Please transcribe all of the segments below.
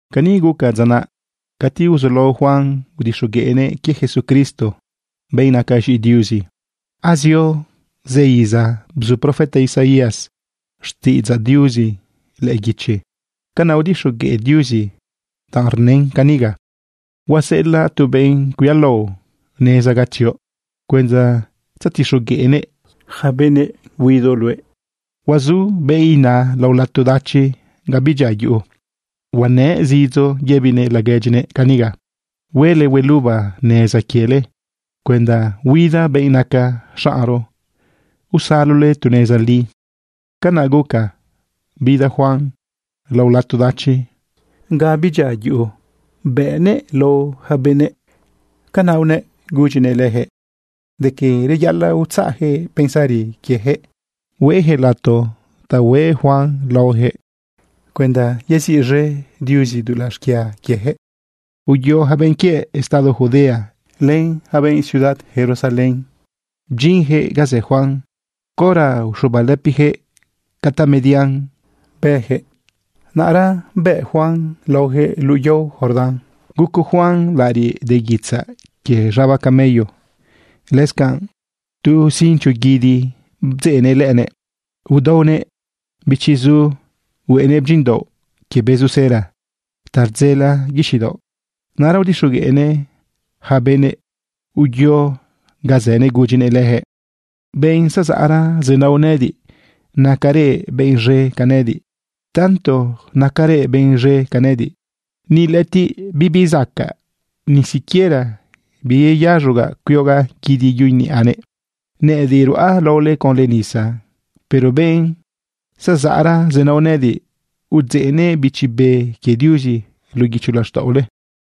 Cani guca dza naꞌ cati uzulao Juan udixogueꞌnëꞌ quie Jesucristo, benꞌ naca z̃iꞌi Diuzi. Azio zëra iza bzu profeta Isaías xtiꞌidzaꞌ Diuzi lëꞌë guichi. Canaꞌ udixogueꞌ Diuzi danꞌ rnën caniga: Huaseꞌelaꞌ tu benꞌ cuialao neza ga tzioꞌ cuenda tzetixogueꞌnëꞌ yaca benëꞌ huidoꞌ luëꞌ. Huazu benꞌ naꞌ lao lato dachi ga bidyia yuꞌu, huanëꞌ zidzo yëbinëꞌ laguedyinëꞌ caniga: “Huele hueluba neza quiele cuenda huida benꞌ naca xaꞌnro, usalole tu neza li.” Canaꞌ guca bida Juan lao lato dachi ga bidyia yuꞌu, bëꞌnëꞌ lao yaca benëꞌ. Canaꞌ unëꞌ gudyinëꞌ leyaquëꞌ de quie reyaꞌalaꞌ utzaꞌyaquëꞌ pensari quieyaquëꞌ, hueyaquëꞌ lato ta hueꞌ Juan laoyaquëꞌ cuenda yeziꞌz̃e Diuzi dulaꞌ xquia quieyaquëꞌ. Uyo yaca benꞌ quie estado Judea len yaca benꞌ ciudad Jerusalén, bdyinyaquëꞌ ga zë Juan. Caora uxubalëpiyaquëꞌ ca tamedian bëyaquëꞌ, naꞌra bëꞌ Juan laoyaquëꞌ luꞌu yao Jordán. Guco Juan laꞌariꞌ de guitzaꞌ quie z̃aba camello. Lëscanꞌ tu cincho guidi bdzeꞌnëꞌ lëꞌënëꞌ. Udaonëꞌ bëchiꞌzu, hueꞌenëꞌ bdyinꞌdaoꞌ quie bezu cera ta rdzela guixiꞌ daoꞌ. Naꞌra udixogueꞌnëꞌ yaca benꞌ uyo ga zënëꞌ gudyinëꞌ leyaquëꞌ: ―Benꞌ zezaꞌra zenao nëꞌëdiꞌ, nacarëꞌ benꞌ z̃e ca nëꞌëdiꞌ. Tanto nacarëꞌ benꞌ z̃e ca nëꞌëdiꞌ, ni lëꞌëtiꞌ bibi zacaꞌ ni siquiera biyeyaz̃ogaꞌ cuiogaꞌ guidi yuꞌu niꞌanëꞌ. Nëꞌëdiꞌ ruꞌa laole conlë nisa, pero benꞌ zezaꞌra zenao nëꞌëdiꞌ, udzeꞌnëꞌ Bichi Be quie Diuzi luꞌu guicho laxtaꞌole.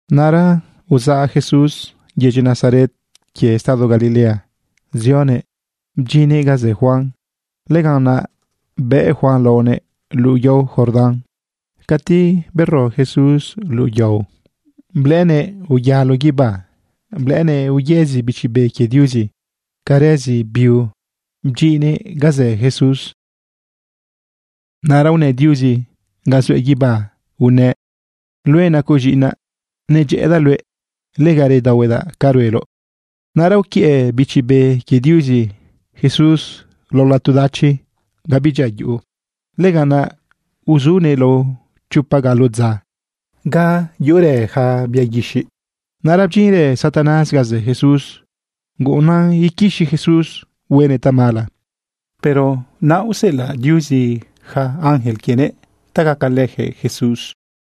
Naꞌra uzaꞌ Jesús yedyi Nazaret quie estado Galilea zionëꞌ bdyinnëꞌ ga zë Juan. Lëganꞌ naꞌ bëꞌ Juan laonëꞌ luꞌu yao Jordán. Cati bero Jesús luꞌu yao, blëꞌënëꞌ uyalo guibá, blëꞌënëꞌ uyëzi Bichi Be quie Diuzi ca rëzi biu bdyinnëꞌ ga zë Jesús. Naꞌra unë Diuzi ga zuëꞌ guibá unëꞌ: ―Luëꞌ nacoꞌ z̃iꞌinaꞌ, nedyëꞌëdaꞌ luëꞌ. Lega redaohuedaꞌ ca rueloꞌ. Naꞌra uquiëꞌ Bichi Be quie Diuzi Jesús lao lato dachi ga bidyia yuꞌu. Lëganꞌ naꞌ uzunëꞌ lao chopa galo dza ga uzurë yaca bia guixiꞌ. Naꞌra bdyinrë Satanás ga zë Jesús guꞌunnan iquixi Jesús huenëꞌ tamala. Pero naꞌa useꞌelaꞌ Diuzi yaca ángel quienëꞌ ta gacalëyaquëꞌ Jesús.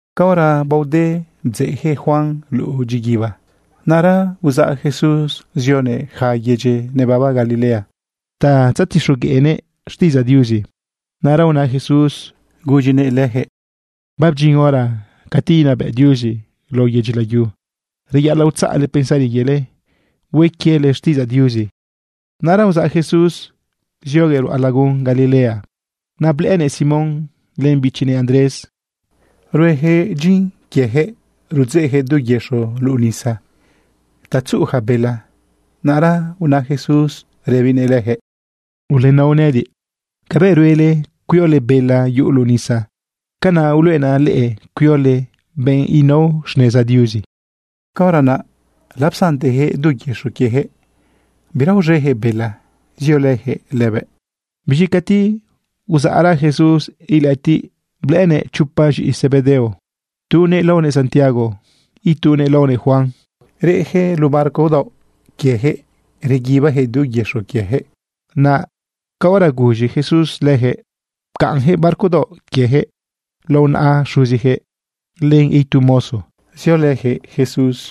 Caora baode bdzeꞌyaquëꞌ Juan luꞌu dyiguiba, naꞌra uzaꞌ Jesús zionëꞌ yaca yedyi nebaba Galilea ta tzetixogueꞌnëꞌ xtiꞌidzaꞌ Diuzi. Naꞌra una Jesús gudyinëꞌ leyaquëꞌ: ―Babdyin hora cati inabëꞌ Diuzi lao yedyi layu. Reyaꞌalaꞌ utzaꞌle pensari quiele, hue quiele xtiꞌidzaꞌ Diuzi. Naꞌra uzaꞌ Jesús zioguëꞌ ruꞌa lagun Galilea. Naꞌ blëꞌënëꞌ Simón len bichinëꞌ Andrés. Rueyaquëꞌ dyin quieyaquëꞌ rudzeꞌyaquëꞌ du yëxo luꞌu nisa ta tzuꞌu yaca bela. Naꞌra una Jesús rëbinëꞌ leyaquëꞌ: ―¡Ulenao nëꞌëdiꞌ! Cabëꞌ ruele cuiole bela yuꞌu luꞌu nisa, canaꞌ uluꞌenaꞌ leꞌe cuiole benꞌ nao xneza Diuzi. Caora naꞌ lapsanteyaquëꞌ du yëxo quieyaquëꞌ, bira uz̃eyaquëꞌ bela, ziolëyaquëꞌ lëbëꞌ. Biz̃i cati uzaꞌra Jesús ilëꞌëtiꞌ, blëꞌënëꞌ chopa z̃iꞌi Zebedeo, tunëꞌ laonëꞌ Santiago, itunëꞌ laonëꞌ Juan. Reꞌyaquëꞌ luꞌu barco daoꞌ quieyaquëꞌ reguibayaquëꞌ du yëxo quieyaquëꞌ. Naꞌ caora guz̃i Jesús leyaquëꞌ, pcaꞌnyaquëꞌ barco daoꞌ quieyaquëꞌ lao naꞌa xuziyaquëꞌ len itu mozo, ziolëyaquëꞌ Jesús.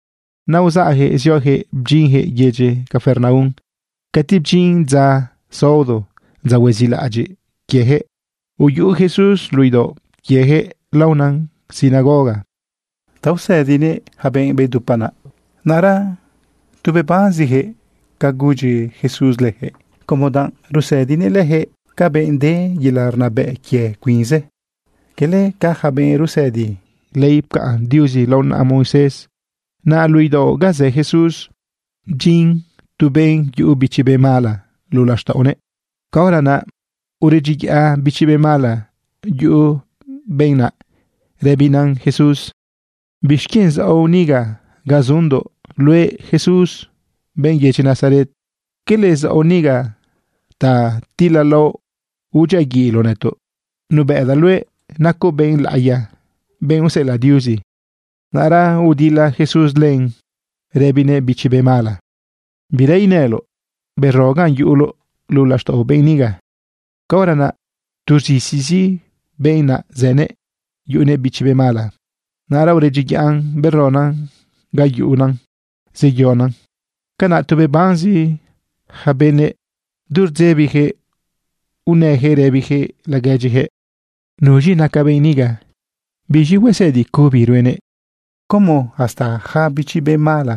Naꞌ uzaꞌyaquëꞌ zioyaquëꞌ bdyinyaquëꞌ yedyi Capernaum. Cati bdyin dza saodo, dza huezilaꞌadyiꞌ quieyaquëꞌ, uyuꞌu Jesús luꞌu idaoꞌ quieyaquëꞌ laona sinagoga ta usëdinëꞌ yaca benꞌ bedupa naꞌ. Naꞌra tu bebanziyaquëꞌ ca gudyi Jesús leyaquëꞌ, como danꞌ rusëdinëꞌ leyaquëꞌ ca benꞌ de yelaꞌ rnabëꞌ quie cuinzëꞌ, cala ca yaca benꞌ rusëdi ley pcaꞌn Diuzi lao naꞌa Moisés. Naꞌ luꞌu idaoꞌ ga zë Jesús bdyin tu benꞌ yuꞌu bichi be mala luꞌu laxtaꞌonëꞌ. Caora naꞌ uredyiyaꞌ bichi be mala yuꞌu benꞌ naꞌ rëbinan Jesús: ―¿Bixquienꞌ zaoꞌ niga ga zundoꞌ, luëꞌ Jesús, benꞌ yedyi Nazaret? ¿Quele zaoꞌ niga ta tilalaoꞌ udyiaguiꞌloꞌ nëtoꞌ? Nubëꞌdaꞌ luëꞌ, nacoꞌ benꞌ laꞌiya, benꞌ useꞌelaꞌ Diuzi. Naꞌra udila Jesús lëbin, rëbinëꞌ bichi be mala: ―¡Bira inëloꞌ! ¡Bero ganꞌ yuꞌuloꞌ luꞌu laxtaꞌo benꞌ niga! Caora naꞌ tu rz̃izizi benꞌ naꞌ zënëꞌ yuꞌunëꞌ bichi be mala, naꞌra uredyiyaꞌn beronan gan yuꞌun zeyonan. Canaꞌ tu bebanzi yaca benëꞌ, du rdzebiyaquëꞌ unëyaquëꞌ rëbiyaquëꞌ laguedyiyaquëꞌ: ―¿Nuz̃i naca benꞌ niga? ¿Biz̃i huesëdi cubi ruenëꞌ? ¿Como hasta yaca bichi be mala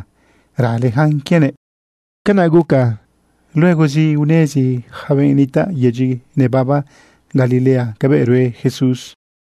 raleyacan quienëꞌ? Canaꞌ guca luegozi unezi yaca benꞌ nitaꞌ yedyi nebaba Galilea cabëꞌ rue Jesús.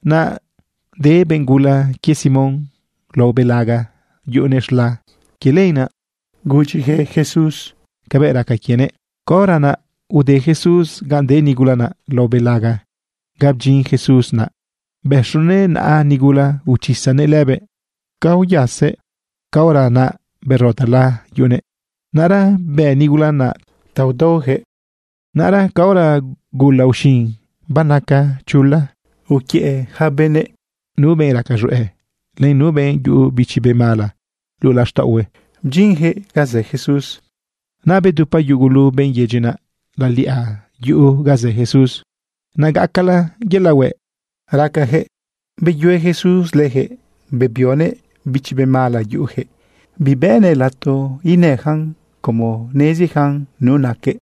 Naꞌ de benꞌ gula quie Simón lao belaga yuꞌunëꞌ z̃la. Quie lenaꞌ gudyiyaquëꞌ Jesús cabëꞌ raca quienëꞌ. Caora naꞌ ude Jesús ganꞌ de nigula naꞌ lao belaga. Ca bdyin Jesús naꞌ, bëxunëꞌ naꞌa nigula, uchisanëꞌ lëbëꞌ. Ca uyasëꞌ, caora naꞌ bero tala yuꞌunëꞌ. Naꞌra bë nigula naꞌ ta udaoyaquëꞌ. Naꞌra caora gula uxin banaca chula, uquiëꞌ yaca benëꞌ nu benꞌ raca z̃hueꞌ, len nu benꞌ yuꞌu bichi be mala luꞌu laxtaꞌohuëꞌ, bdyinyaquëꞌ ganꞌ zë Jesús. Naꞌ bedupa yugulu benꞌ yedyi naꞌ laliꞌa yuꞌu ga zë Jesús. Naꞌ nacala yelaꞌ hueꞌ racayaquëꞌ, beyue Jesús leyaquëꞌ, bebionëꞌ bichi be mala yuꞌuyaquëꞌ. Bibëꞌnëꞌ lato inëyacan como neziyacan nu naquëꞌ.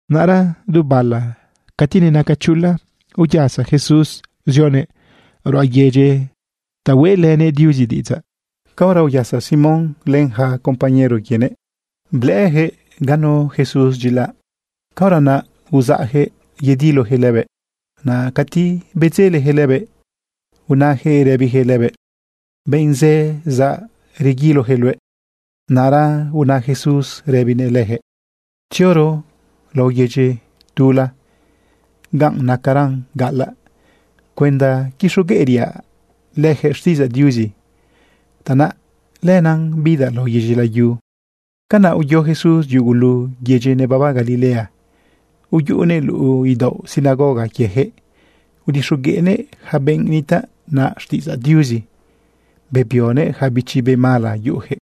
Naꞌra du bala cati nenaca chula, uyasa Jesús zionëꞌ ruꞌa yedyi ta hueꞌlënëꞌ Diuzi diꞌidzaꞌ. Caora uyasa Simón len yaca compañero quienëꞌ, blëꞌëyaquëꞌ ganu Jesús dyilaꞌ, caora naꞌ uzaꞌyaquëꞌ yediloyaquëꞌ lëbëꞌ. Naꞌ cati bedzeleyaquëꞌ lëbëꞌ, unëyaquëꞌ rëbiyaquëꞌ lëbëꞌ: ―Benꞌ zë zaꞌ, rguiloyaquëꞌ luëꞌ. Naꞌra una Jesús rëbinëꞌ leyaquëꞌ: ―Tzioro lao yedyi tula ganꞌ nacara gaꞌalaꞌ cuenda quixogueꞌriaꞌ leyaquëꞌ xtiꞌidzaꞌ Diuzi. Tanaꞌ lenaꞌ bidaꞌ lao yedyi layu. Canaꞌ uyo Jesús yugulu yedyi nebaba Galilea, uyuꞌunëꞌ luꞌu idaoꞌ sinagoga quieyaquëꞌ udixogueꞌnëꞌ yaca benꞌ nitaꞌ naꞌ xtiꞌidzaꞌ Diuzi, bebionëꞌ yaca bichi be mala yuꞌuyaquëꞌ.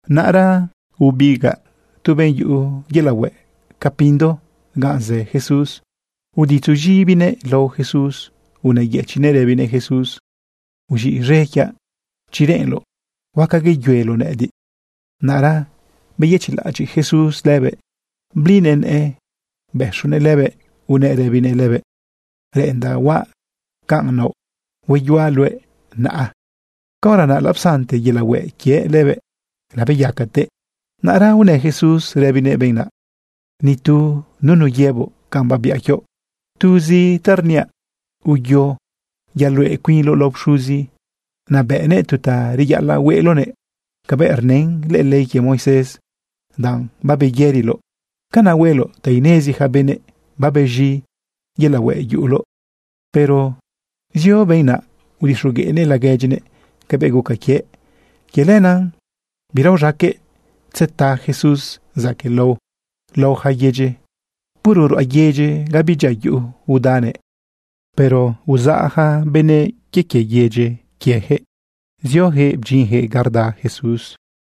Naꞌra bebigaꞌ tu benꞌ yuꞌu yelaꞌ hueꞌ ca pindo ganꞌ zë Jesús, uditzu z̃ibinëꞌ lao Jesús unëyëchiꞌnëꞌ rëbinëꞌ Jesús: ―Uz̃iꞌz̃e quiaꞌ. Chi reꞌenloꞌ, huaca yeyueloꞌ nëꞌëdiꞌ. Naꞌra beyëchiꞌlaꞌadyiꞌ Jesús lëbëꞌ. Blinëꞌ nëꞌë bëxunëꞌ lëbëꞌ unëꞌ rëbinëꞌ lëbëꞌ: ―Reꞌendaꞌ huaꞌ ca naoꞌ. Hueyuaꞌ luëꞌ naꞌa. Caora naꞌ lapsante yelaꞌ hueꞌ quiëꞌ lëbëꞌ, labeyacatëꞌ. Naꞌra unë Jesús rëbinëꞌ benꞌ naꞌ: ―Ni tu nunu yëboꞌ canꞌ babiaꞌ quioꞌ. Tuzi ta rniaꞌ, uyo yaluꞌe cuinloꞌ lao pxuzi. Naꞌ bëꞌnëꞌ tu ta reyaꞌalaꞌ hueꞌloꞌnëꞌ cabëꞌ rnë lëꞌë ley quie Moisés danꞌ babeyëriloꞌ. Canaꞌ hueloꞌ ta inezi yaca benëꞌ babez̃i yelaꞌ hueꞌ yuꞌuloꞌ. Pero zio benꞌ naꞌ udixogueꞌnëꞌ laguedyinëꞌ cabëꞌ guca quiëꞌ. Quie lenaꞌ bira uz̃aqueꞌ tzeta Jesús zaquëꞌlao laꞌo yaca yedyi. Puro ruꞌa yedyi ga bidyia yuꞌu udanëꞌ. Pero uzaꞌ yaca benëꞌ quie quie yedyi quieyaquëꞌ zioyaquëꞌ bdyinyaquëꞌ ga rda Jesús.